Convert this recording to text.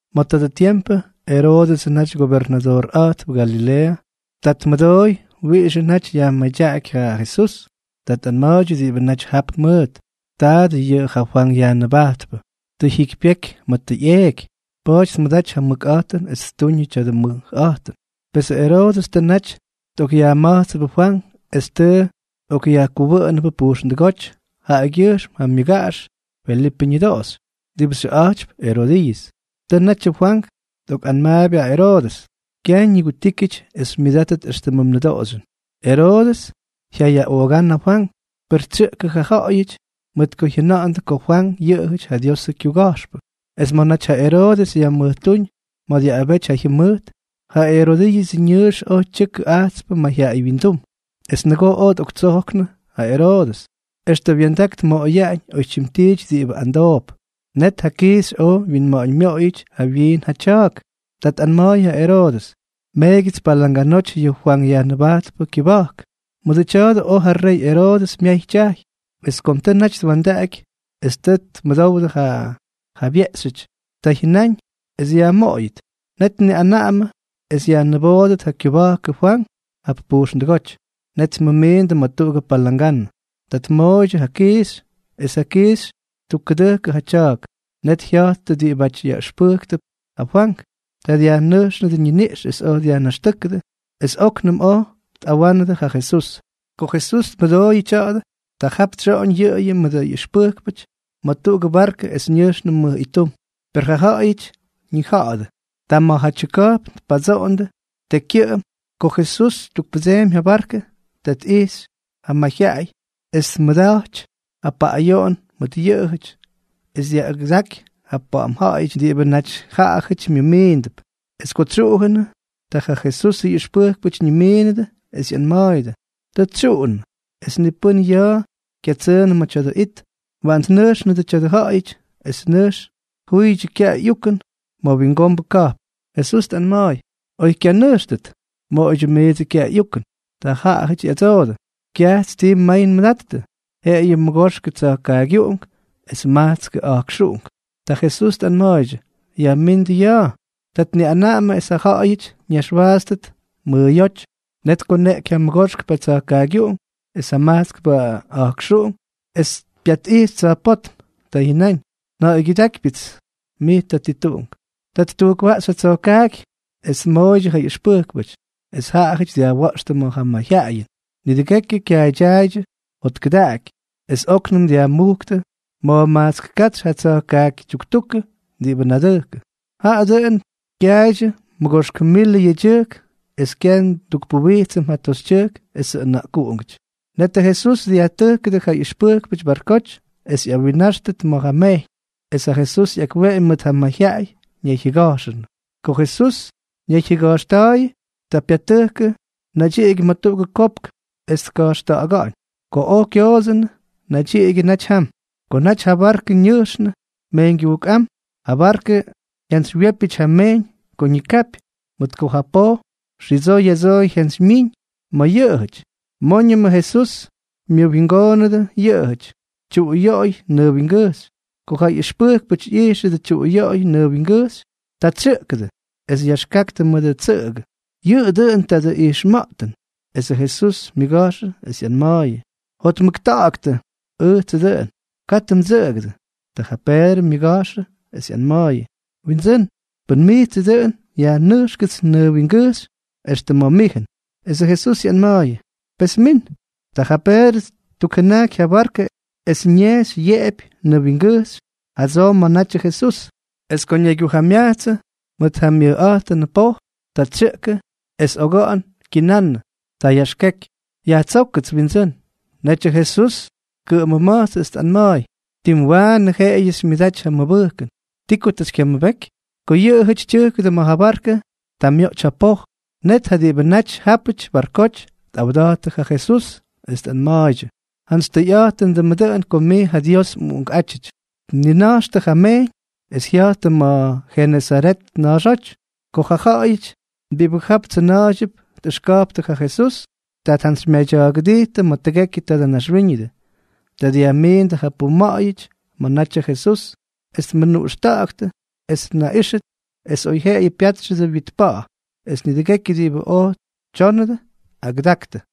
Ma̱ tadʉ tiempʉ Eroodʉsʉ naty gobernadoorꞌa̱jtp Galileeʉ. Ta tmʉdoy wiꞌixʉ naty yajmadyaꞌaky ja Jesús. Ta tꞌanma̱a̱ydyʉ diꞌibʉ naty jap mʉʉt: —Taadʉ yʉꞌʉ ja Fwank Yajnʉbajtpʉ. Tʉ jyikypyeky ma̱ tʉ ꞌyeeky, pa̱a̱ty tmʉdaty ja mʉkꞌa̱jtʉn es ttuñʉ tya̱dʉ mʉjꞌa̱jtʉn. Pesʉ Eroodʉs tʉ naty tꞌokꞌyajma̱jtsʉbʉ Fwank es tʉ tꞌokꞌyajkʉwʉꞌʉnʉbʉ pujxndʉgóty jaꞌagyʉjxm ja myʉgaꞌax Felipʉ ñʉdoꞌoxy, diꞌibʉ xyʉꞌa̱jtp Erodiiʉs. Tʉ natyʉ Fwank tꞌokꞌanmaapy ja Eroodʉs: —Kyaj ñigutíkyʉty es xymyʉdátʉt éxtʉmʉ mnʉdoꞌoxyʉn. Eroodʉs jyayaꞌoogán ja Fwank, per tsyʉꞌkʉ ja ja̱ꞌa̱yʉty mʉt ko jyʉna̱ꞌa̱ndʉ ko Fwank yʉꞌʉjʉty ja Diosʉ kyuga̱jxpʉ. Es ma̱ naty ja Eroodʉs yajmʉjtúñ ma̱ dyaꞌꞌabety ja jyʉmʉjt, ja Erodiiʉsʉ ñʉʉx oj tyʉkʉ ajtspʉ mayjyaꞌaywyindúm. Es nʉgoo oj tꞌoktsojknʉ ja Eroodʉs, extʉ wya̱ndak tmoꞌoyaꞌañ oytyim tiity diꞌibʉ amdoop. Net ja kiixy oj wyinma̱ꞌa̱ñ myoꞌoyʉty jawyiin ja tya̱a̱k. Ta tꞌanma̱a̱y ja Eroodʉs: —Meegyʉts palanganoty yʉ Fwank Yajnʉbajtpʉ kyʉba̱jk. Mʉdʉ tya̱a̱dʉ oj ja rey Eroodʉs myay tyajy. Es kom tʉ naty twa̱ndaꞌaky es tʉ tmʉdowdʉ ja jabyeꞌxyʉty, ta jyʉnáñ es yajmoꞌoyʉt. Net tniꞌanaꞌamʉ es yajniboodʉt ja kyʉba̱jkʉ Fwank jap pujxndʉgóty. Net tmʉmiindʉ ma̱ tuꞌugʉ palanganʉ. Ta tmooydyʉ ja kiixy, es ja kiixy ttukkʉdʉjkʉ ja tya̱a̱k. Net jya̱jttʉ diꞌibáty yaꞌʉxpʉjktʉp ja Fwank. Ta dyajnʉjxʉdʉ ñiniꞌx es oj dyajnaxtʉ́kʉdʉ, es óknʉm oj tꞌawánʉdʉ ja Jesús. Ko Jesús tmʉdooyʉ tya̱a̱dʉ, ta jap tsyoꞌoñ yʉꞌʉyʉ mʉdʉ ꞌyʉxpʉjkpʉty ma̱ tuꞌugʉ barkʉ es ñʉjxnʉ mʉj ittum. Per ja ja̱ꞌa̱yʉty ñija̱ꞌa̱dʉ. Ta ma̱jatyʉ ka̱jpn tpadsoꞌondʉ tekykyʉꞌʉm. Ko Jesús ttukpʉdseemy ja barkʉ, ta tꞌijxy ja mayjyaꞌay es tmʉda̱jty ja paꞌꞌayoꞌon mʉt yʉꞌʉjʉty, es dyaꞌꞌagʉdaky ja pa̱ꞌa̱m ja̱ꞌa̱yʉty diꞌibʉ naty jaꞌajʉty myʉmiindʉp. Es ko tsyuꞌujʉnʉ, ta ja Jesusʉ ꞌyʉxpʉjkpʉty ñimiinʉdʉ es ꞌyanma̱a̱yʉdʉ: —Tʉ tsyuꞌunʉ, es ni pʉ́n ya̱a̱ kyatsʉʉnʉ ma̱ tya̱dʉ it. Waꞌan tnʉjxnʉdʉ tya̱dʉ ja̱ꞌa̱yʉty, es nʉjx tjuydyʉ kyaꞌay ꞌyukʉn ma̱ wingombʉ ka̱jpn. Jesús tꞌanma̱a̱y: —Oy kyanʉjxtʉt. Moꞌoydyʉ miidsʉ kyaꞌay ꞌyukʉn. Ta jaꞌajʉty ꞌyadsoodʉ: —Kyajts ti may nmʉdattʉ, jeꞌeyʉ mʉgoxkʉ tsa̱jkaagyuꞌunk es majtskʉ a̱jkxuꞌunk. Ta Jesús tꞌanma̱a̱ydyʉ: —Yajmíndʉ ya̱a̱. Ta tniꞌanaꞌamʉ es ja ja̱ꞌa̱yʉty ñaxwaatstʉt mʉʉyóty. Net tkoneꞌky ja mʉgoxkpʉ tsa̱jkaagyuꞌunk es ja majtskpʉ a̱jkxuꞌunk, es pyatꞌijxy tsa̱jpótm. Ta jyʉnáñ: —Nja̱ꞌa̱ygyʉdákypyʉts mij Tatituꞌunk. Ta ttujkwaꞌxy ja tsa̱jkaaky es tmooydyʉ ja ꞌyʉxpʉjkpʉty, es jaꞌajʉty dyajwa̱ꞌxtʉ ma̱ ja mayjyaꞌayʉn. Nidʉgekyʉ kyaaydyaaydyʉ jotkʉdaꞌaky. Es óknʉm dyajmujktʉ ma̱jmajtsk katsy ja tsa̱jkaaky tyuktukʉ diꞌibʉ nadʉjkʉ. Jaꞌa dʉꞌʉn kyaaydyʉ mʉgoxk milʉ yedyʉjk, es kyaj ndukpuwijtsʉm ja toxytyʉjk esʉ ʉna̱ꞌkuꞌungʉty. Net Jesús dyajtʉjkʉdʉ ja ꞌyʉxpʉjkpʉty barkoty es ꞌyawinnáxtʉt ma̱ ja mejyñ, es ja Jesús ꞌyakweꞌemy mʉt ja mayjyaꞌay, ñayjyʉga̱jxʉnʉ. Ko Jesús ñayjyʉga̱jxta̱a̱yʉ, ta pyatʉjkʉ naydyiꞌigyʉ ma̱ tuꞌugʉ kopk es tka̱jxta̱ꞌa̱ga̱ꞌa̱ñ. Ko oj kyoodsʉnʉ, nadyiꞌigyʉ naty jam. Ko naty ja barkʉ ñʉjxnʉ mejyñgyujkꞌám, ja barkʉ jyantsywyépyʉty ja mejyñ ko ñikapy, mʉt ko ja poj xidsoo ya̱dsoo jyantsymyíñ ma̱ yʉꞌʉjʉty. Móñʉmʉ Jesús myʉwingoonʉdʉ yʉꞌʉjʉty, tyuꞌuyoꞌoy nʉʉ wingʉjxy. Ko ja ꞌyʉxpʉjkpʉty ꞌyijxʉdʉ tyuꞌuyoꞌoy nʉʉ wingʉjxy, ta tsyʉꞌkʉdʉ, es yaxkaktʉ mʉdʉ tsʉꞌʉgʉ: —¡Yʉꞌʉ dʉꞌʉn tuꞌugʉ ijxma̱ꞌtʉn! Esʉ Jesús myʉga̱jxʉ, es ꞌyanma̱a̱yʉ: —¡Jotmʉkta̱ꞌa̱ktʉ! Ʉjtsʉ dʉꞌʉn. Katʉ mdsʉꞌʉgʉdʉ. Ta ja Peedrʉ myʉga̱jxʉ es ꞌyanma̱a̱yʉ: —Windsʉ́n, pʉn mijtsʉ dʉꞌʉn, yajnʉjxkʉts nʉʉ wingʉjxy extʉ ma̱ mijʉn. Esʉ Jesús ꞌyanma̱a̱yʉ: —Pes min. Ta ja Peedrʉ ttukjʉnajky ja barkʉ es ñejxy yeꞌepy nʉʉ wingʉjxy jadsoo ma̱ natyʉ Jesús. Es ko ñaygyujamyajtsʉ mʉt ja myʉkꞌa̱jtʉnʉ poj, ta tsyʉꞌkʉ es oga̱ꞌa̱n kyinannʉ. Ta yaxkeky: —Yajtsókʉts, Windsʉ́n. Netyʉ Jesús tkʉꞌʉmʉma̱jtsʉ, es tꞌanma̱a̱y: —¡Tim waanʉ jeꞌeyʉ xymyʉdaty ja mʉbʉjkʉn! ¿Ti ko tʉ xykyamʉbeky? Ko yʉꞌʉjʉty tyʉjkʉdʉ ma̱ ja barkʉ, ta myoꞌty ja poj. Net ja diꞌibʉ naty jápʉty barkoty tꞌawda̱jttʉ ja Jesús, es tꞌanma̱a̱ydyʉ: —¡Jantsy tʉyꞌa̱jtʉndʉmʉ dʉꞌʉn ko mij ja Dios mꞌUꞌunkꞌátyʉty! Tnina̱jxtʉ ja mejyñ es jya̱jttʉ ma̱ Jenesaret ña̱a̱xóty. Ko ja ja̱ꞌa̱yʉty diꞌibʉ jap tsʉna̱a̱ydyʉp tꞌʉxka̱jptʉ ja Jesús, ta tjantsymyadya̱a̱gʉdijttʉ ma̱ tʉgekyʉ tadʉ naxwíñʉdʉ. Ta dyajmiindʉ ja puma̱ꞌa̱yʉty ma̱ natyʉ Jesús, es tmʉnuꞌxta̱ꞌa̱ktʉ es tnaꞌíxʉt es oyjyeꞌeyʉ pyátxʉdʉ wyit pa̱ꞌa̱; es nidʉgekyʉ diꞌibʉ oj tyónʉdʉ, agʉdaktʉ.